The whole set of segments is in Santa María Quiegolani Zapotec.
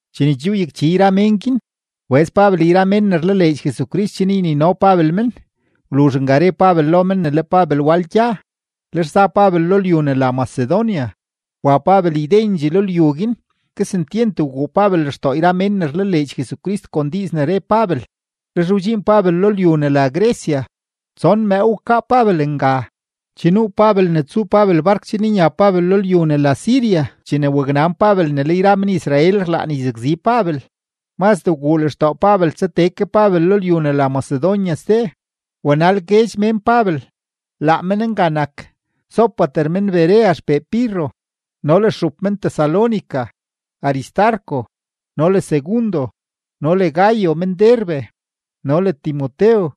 Chene che wyakchi yra mén guin, wbëz Pabel yra mén ne rlaleedx Jesucrist chen ynino Pabel men. Wluzh nga re Pabel lo men ne le Pabel wal gya, lex za Pabel lo lyu ne la Macedonia. Wa Pabel ydendxee lo lyu guin, kesentyent wguu Pabel lextoo yra mén ne rlaleedx Jesucrist kon yra diiz ne re Pabel, lex wdxiin Pabel lo lyu ne la Grecia. Tson mëëw wkaa Pabel nga. Che nuu Pabel ne tsuu Pabel bark chen nya Pabel lo lyu ne la Siria, chene waknan Pabel ne le yra men-Israel rlaan yzakzi Pabel. Mazdee wguu lextoo Pabel tsa tee ke Pabel lo lyu ne la Macedonia ste. Wanal guedx mén Pabel; laa men nga nak: Sópater men-Berea xpee Pirro, no le stxup men-Tesalónica Aristarco no le Segundo, no le Gayo men-Derbe, no le Timotew,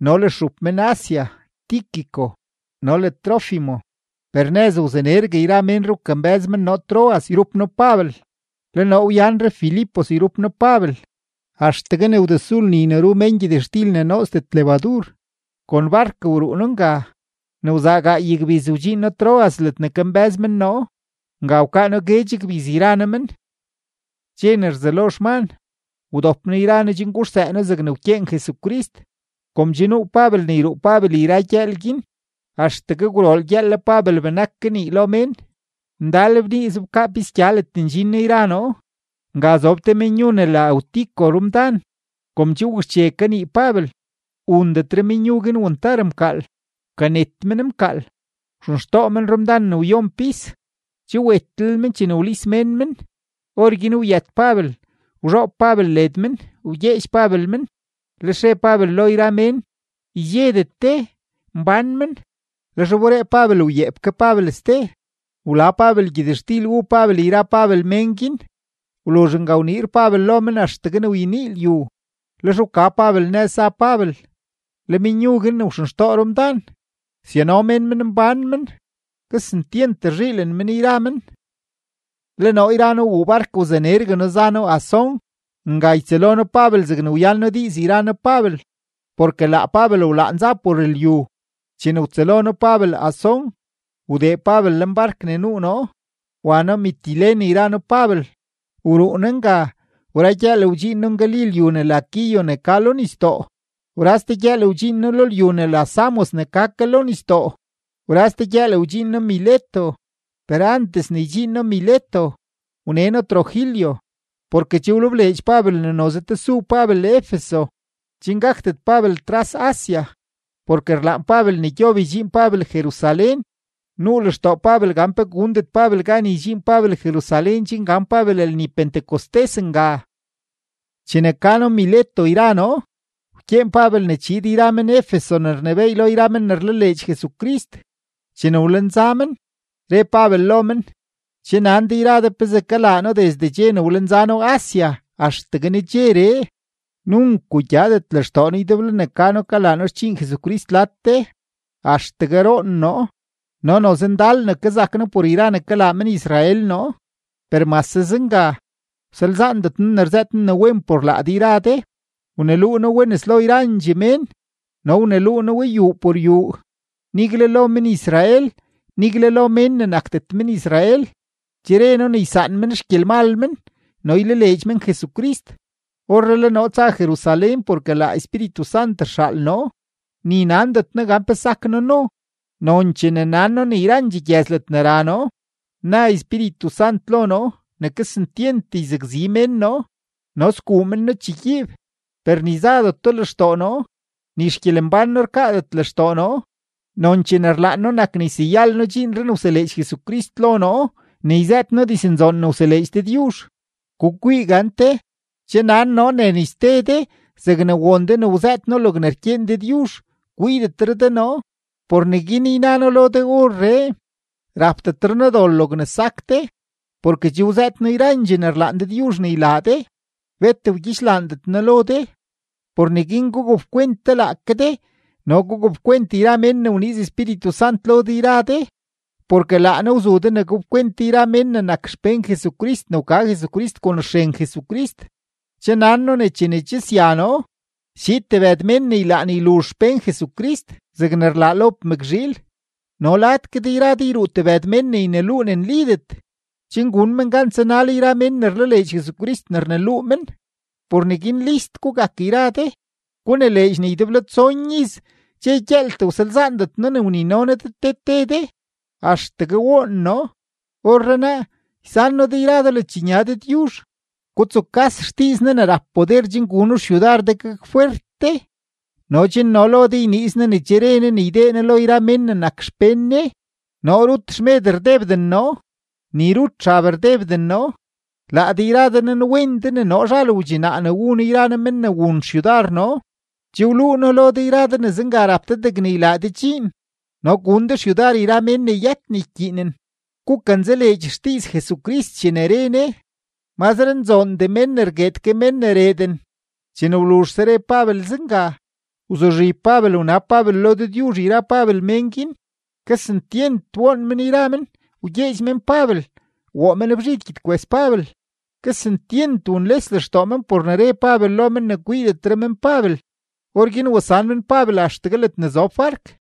no le stxup men-Asia Tíquico no le Trófimo. Per nëz wzanergue yra menree wkambë́z men noo Troas yrup noo Pabel. Le noo wyanre Filipos yrup noo Pabel; axtegue ne wdesu lni ne ru mén gyëtxtil ne nootsdet lebadur, kon bark wruu noo nga; ne wzaa gaay gbiz wdxiin noo Troas ledne kambë́z men noo. Nga wkaa noo guedx gbiz yra noo men. Dxe ne rzelo xman, wdop noo yra noo chen guxsëë noo zegne wkyeen Jesucrist. Kom che nuu Pabel ne yruu Pabel yra gyëël guin, axtegue gwrool gyëël le Pabel benak kanii lo mén. Ndal bnii zobkaa pisgya ledne ndxin noo yra noo. Nga zob te menyu ne la Eutico te rumdan. Kom che wakxche kanii Pabel, wundetre menyu guin wantar mkaal, wkanet men mkaal, wxenxtoo men rumdan ne wyon pis. Che wetlel men chene wlis mén men. Orguin wyët Pabel, wzhoob Pabel led men, wgyeedx Pabel men, lex re Pabel lo yra mén: ―Ydxedet de; mbán men. Lex wberee Pabel wyeep ke Pabel ste. Wla Pabel gyëtxtil wu Pabel yra Pabel men guin. Wluzh nga wniir Pabel lo men axtegue ne wyenii lyu; lex wka Pabel nëz za Pabel. Le menyu guin ne wxenxtoo rumdan, syano mén men mbán men. Kesentyent rzhiilen men yra men. Le noo yra noo wuu bark wzanergue noo za noo Asón; nga ytsëlo noo Pabel zegne wyan noo diiz yra noo Pabel, porke laa Pabel wlaan za por lyu. Chene wtsëlo noo Pabel Asón, wdee Pabel lenbark ne nuu noo, wa noo Mitilene yra noo Pabel. Wruu noo nga; wra gyëël wdxiin noo ngali lyu ne la Quío ne ka lo nisdoo. Wra ste gyëël wdxiin noo lo lyu ne la Samos ne ka ke lo nisdoo; wra ste gyëël guin wdxiin noo Mileto; per antes ne ydxiin noo Mileto, wne noo Trogilio. Porke che wlebleedx Pabel ne noze tesu Pabel Efeso, chen gakdet Pabel tras Asia, porke rlaan Pabel ne gyob ydxiin Pabel Jerusalén. Nuu lextoo Pabel gan pe gundet Pabel gan ydxiin Pabel Jerusalén chen gan Pabel lni Pentecostés nga. Chene ka noo Mileto yra noo, wkyeen Pabel ne chiid yra men-Efeso ne rnebééy lo yra men ne rlaleedx Jesucrist. Chene wlenza men, re Pabel lo men: ―Che nan de yra de pezee kalaa noo desde dxe ne wlenza noo Asia axtegue nedxeree. Nunk wugyadet lextoo noo ydeblo ne kalaa noo xdxiin Jesucrist lad de, axtegue roon noo, no noze ndal ne kazak noo por yra ne kalaa men-Israel noo. Per mase zenga, wsalzaandet noo ne rzëët noo ne wen por laa de yra de; wneluu noo we nes lo yrandxee mén no wneluu noo we yuu por yuu. Nigle lo men-Israel, nigle lo mén ne nakdet men-Israel, che re noo ne ysaan men xgyelmal men no ylaleedx men Jesucrist. Orree le noo tsa Jerusalén porke laa Espíritu Sant rxaal noo, ni nandet noo gan pe sak noo no. Nonchee ne nan noo ne yrandxee gyëz ledne ra noo, na Espíritu Sant lo noo ne kesentyent yzakzi mén noo no sguu men noo chegyiib. Per ni zadeto lextoo noo, ni xgyelembán noo rkaadet lextoo noo, nonchee ne rlaan noo nak ne yseyal noo dxiinree ne wseleedx Jesucrist lo noo ne yzëët noo diznzoon ne wseleedx Dëdyuzh. ’Gukwii gante; che nan noo ne ni ste de zegne won de ne wzëët noo logne rkyeen Dëdyuzh, kwiidetre de noo. Por neguin yna noo lo de orree, rapdetre noo dol logne sak de. Porke che wzëët noo yrandxee ne rlaan Dëdyuzh ne ylaa de, bet wgyixlaandet noo lo de. Por neguin gugapkwent de laake de no gugapkwent yra mén ne wniiz Espíritu Sant lo de yra de, porke laa Ne wzu de ne gapkwent de yra men ne nak xpén Jesucrist ne wka Jesucrist kon xren Jesucrist. Che nan noo ne chene che sya noo, schiid tebëd mén ne ylaan yluzh xpén Jesucrist zegne rlaa lob mëkzhiil. No lad ke de yra de yruu tebëd mén ne yneluu ne nlidet, chen gun men gan tsanal yra mén ne rlaleedx Jesucrist ne rneluu men. Por neguin list gugak yra de; gunileedx ne ydeblo tson iz dxe gyëëltee wsalzaandet noo ne wnino noo de te te de, axtegue woon noo. ’Orrenaa, ysan noo de yra de ledxnya Dëdyuzh. Gutsukas xdiiz Ne ne rap poder chen guno xyudar de gakfwert de no chen no lo de yniiz Ne ne che re Ne ne ydee Ne lo yra mén ne nak xpén Ne. Noo rut xmed rdebden noo, ni rut xab rdebden noo. Laa de yra de nanwen de ne noo zhal wdxinaa ne wu noo yra noo men ne wun xyudar noo. Che wluu noo lo de yra de ne zenga rap de degne ylaa de dxiin no gun de xyudar yra mén ne yët ne ykyiinen; gukanzaleedx xdiiz Jesucrist chene re Ne: “Mazre nzoondee mén ne rgueed ke mén ne reeden.” Chene wluzhse re Pabel zenga, wzuzhib Pabel wnab Pabel lo Dëdyuzh yra Pabel mén guin. Kesentyent woon men yra men, wgyeedx men Pabel, woo men bzhid gyedkwes Pabel. Kesentyent wunles lextoo men por ne re Pabel lo men ne kwiidetre men Pabel. Orguin wasan men Pabel axtegue ledne zob bark.